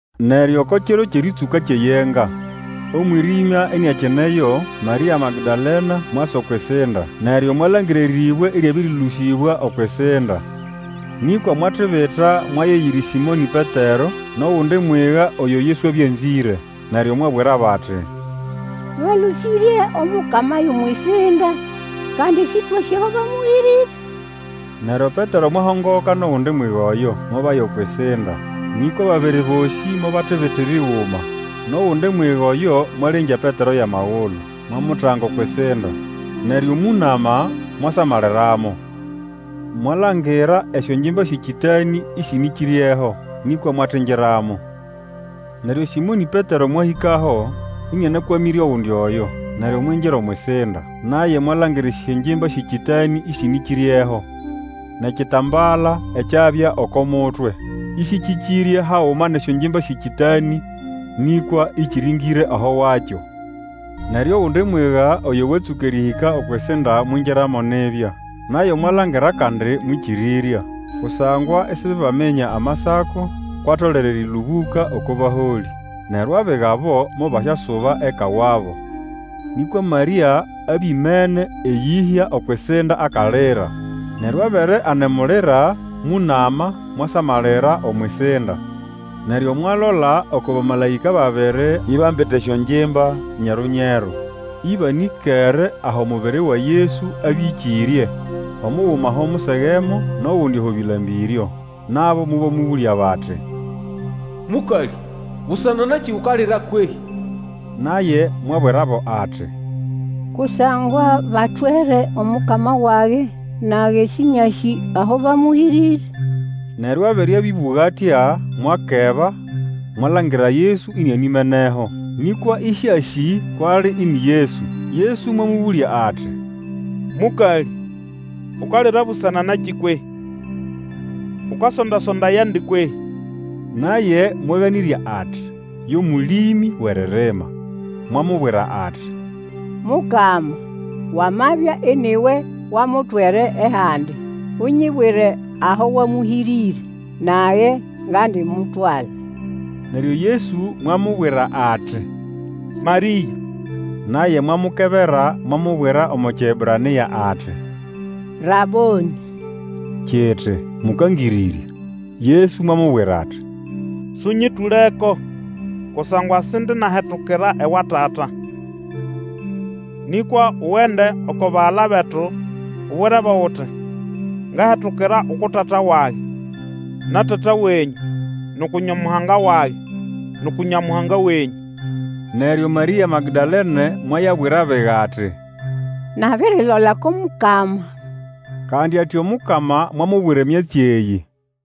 Neryo oko kiro kyʼerĩtsũka kyʼeYenga, omwĩrĩmya iniakineyo, Marĩa Magdalene mwasa okwʼisinda, neryo mwalangira erĩbwe ĩryabĩrĩlũsĩbwa okwʼisinda. Nĩkwa mwatibita mwaya eyiri Sĩmonĩ Petero nʼogundi mwiga oyo Yesu abya anzĩre, neryo mwabwirabo ati, Balũsĩrye Omukama yʼomwʼisinda, kandi Sĩtwasĩ aho bamũhĩrĩre! Neryo Petero mwahongoka nʼogundi mwiga oyo, mobaya okwʼisinda. Nĩkwa ababiri bosĩ mobatibitira iguma, nʼogundi mwiga oyo mwalengya Petero yʼamagulu, mwamutanga okwʼisinda. Neryo mũnama mwasamaliramo, mwalangira esyongimba syʼekĩtanĩ ĩsĩnĩkĩryeho, nĩkwa mwatingiramo. Neryo Sĩmonĩ Petero mwahĩkaho, ĩnĩanakwamĩre ogundi oyo, neryo mwingira omwʼisinda. Naye mwalangira esyongimba syʼekĩtanĩ ĩsĩnĩkĩryeho, nʼekitambala ekyabya oko mutwe, ĩsĩkĩkĩrye haguma nʼesyongimba syʼekĩtanĩ, nĩkwa ĩkĩrĩngĩre aho wakyo. Neryo ogundi mwiga oyo watsũka erĩhĩka okwʼisinda mwingiramo nibya, naye mwalangira kandi mwĩkĩrĩrya. Kusangwa isibebaminya Amasako, kwʼatolere erĩlũbũka oko baholĩ. Neryo abiga abo mobasyasuba eka wabo. Nĩkwa Marĩa abya imene eyĩhya okwʼisinda akalira. Neryo abere anemulira, mũnama mwasamalira omwʼisinda. Neryo mwalola oko bamalaĩka babiri ibambite esyongimba nyeru-nyeru, ĩbanĩkere aho mubiri wa Yesu abya ĩkĩrye, omuguma aho musegemo, nʼogundi aho bĩlambĩryo. Nabo mobamũbũlya bati, Mũkalĩ, busana nakĩ ukalira kwehĩ? Naye mwabwirabo ati, Kusangwa batwere Omukama wage, nage Sĩnyasĩ aho bamũhĩrĩre. Neryo abere abĩbũga atya, mwakeba, mwalangira Yesu inianimeneho, nĩkwa ĩsĩasĩ kwʼali ini Yesu. Yesu mwamũbũlya ati, Mũkalĩ, ukalira busana nakĩ kwehĩ? Ukasonda-sondayandi kwehĩ? Naye mwaganĩrya ati yo mũlĩmĩ wʼeririma, mwamubwira ati, Mukama, wamabya ini we wamutwere ehandi, unyibwire aho wamũhĩrĩre, nage ngandimutwala. Neryo Yesu mwamubwira ati, Marĩa! Naye mwamukebera, mwamubwira omo Kiebranĩa ati, Rabonĩ, kiti, Mũkangĩrĩrya. Yesu mwamubwira ati, Sũnyĩtũleko Kusangwa sindinahetukira ewa Tata. Nĩkwa ugende oko bagala betu ubwirebo uti ngahetukira uku Tata wage, na Tata wenyũ, nʼuku Nyamuhanga wage, nʼuku Nyamuhanga wenyũ. Neryo Marĩa Magdalene mwayabwira abiga ati, Nabirilola oko Mukama. Kandi ati Omukama mwamubwira emyatsi eyĩ.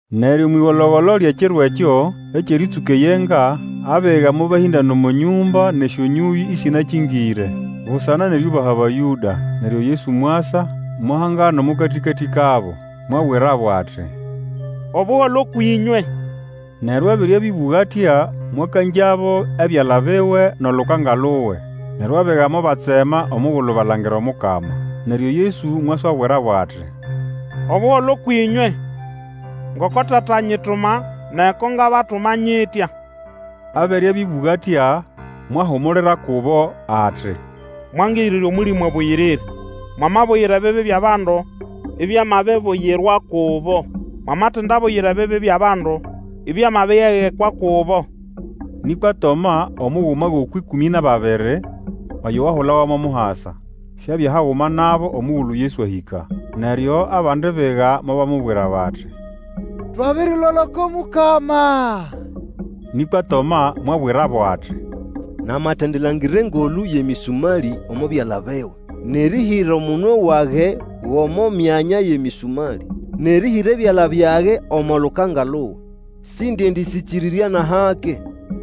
Neryo omwʼĩgolo-golo lyʼekiro ekyo, ekyʼerĩtsũka eyenga, abiga mobahĩndana omo nyũmba nʼesyonyũyĩ ĩsĩnakĩngĩre, busana nʼeriubaha Abayũda. Neryo Yesu mwasa, mwahangana omo katĩkatĩ kabo. Mwabwirabo ati, Obuholo ũkwʼĩnywe! Neryo abere abĩbũga atya, mwakangyabo ebyala biwe, nʼolukanga luwe. Neryo abiga mobatsema omugulu balangira Omukama. Neryo Yesu mwaswabwirabo ati, Obuholo kwʼĩnywe. Ngoko Tata anyituma, nage ko ngabatuma nyitya. Abere abĩbũga atya, mwahumulira kubo ati, Mwangirire Omũlĩmũ Abũyĩrĩre. Mwamabuyira ebibi byʼabandu, ibyamabibuyirwa kubo; mwamatendibuyira ebibi byʼabandu, ibyamabyegekwa kubo. Nĩkwa Toma, omuguma gʼokwʼĩkũmĩ nʼababiri, oyo wahulawa mo Muhasa, siabya haguma nabo omugulu Yesu ahĩka. Neryo abandi biga mobamubwira bati, Twabirilola oko Mukama! Nĩkwa Toma mwabwirabo ati, Namatendilangira engolũ yʼemĩsũmalĩ omo byala biwe, nʼerĩhĩra omunwe wage gʼomo myanya yʼemĩsũmali nʼerĩhĩra ebyala byage omo lukanga luwe, sindiendĩsyĩkĩrĩrya nʼahake.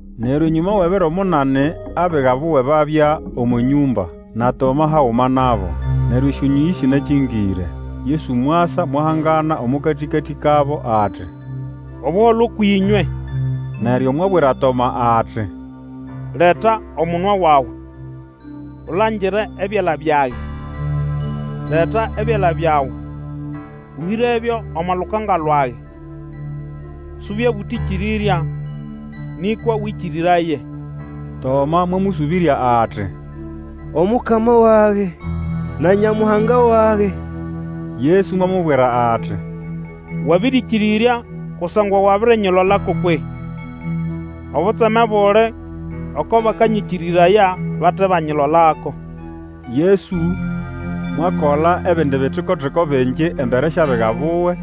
Neryo enyũma wʼebiro munani abiga buwe babya omo nyũmba, na Toma haguma nabo. Neryo esyonyũyĩ ĩsĩnakĩngĩre, Yesu mwasa, mwahangana omo katĩkatĩ kabo, ati, Obuholo ũkwʼĩnywe! Neryo mwabwira Toma ati, Leta omunwe wawe, ulangire ebyala byage. Leta ebyala byawe, ũhĩrebyo omo lukanga lwage, subye bũtĩkĩrĩrya, nĩkwa Wĩkĩrĩraye! Toma mwamũsũbĩrya ati, Omukama wage na Nyamuhanga wage! Yesu mwamubwira ati, Wabĩrĩkĩrĩrya kusangwa wabirinyilolako kwehĩ? Obutseme buli oko bakanyĩkĩrĩraya bate banyilolako. Yesu mwakola ebindi bitiko-tiko bingi embere syʼabiga buwe,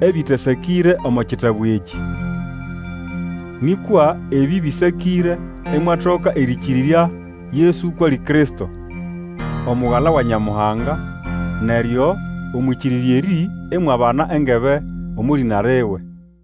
ebĩtasakĩre omo kitabu ekĩ. Nĩkwa ebĩ bĩsakĩre imwatoka erĩkĩrĩrya Yesu kwʼali Kristo, Omugala wa Nyamuhanga, neryo omwʼĩkĩrĩrya erĩ imwabana engebe omo lĩna liwe.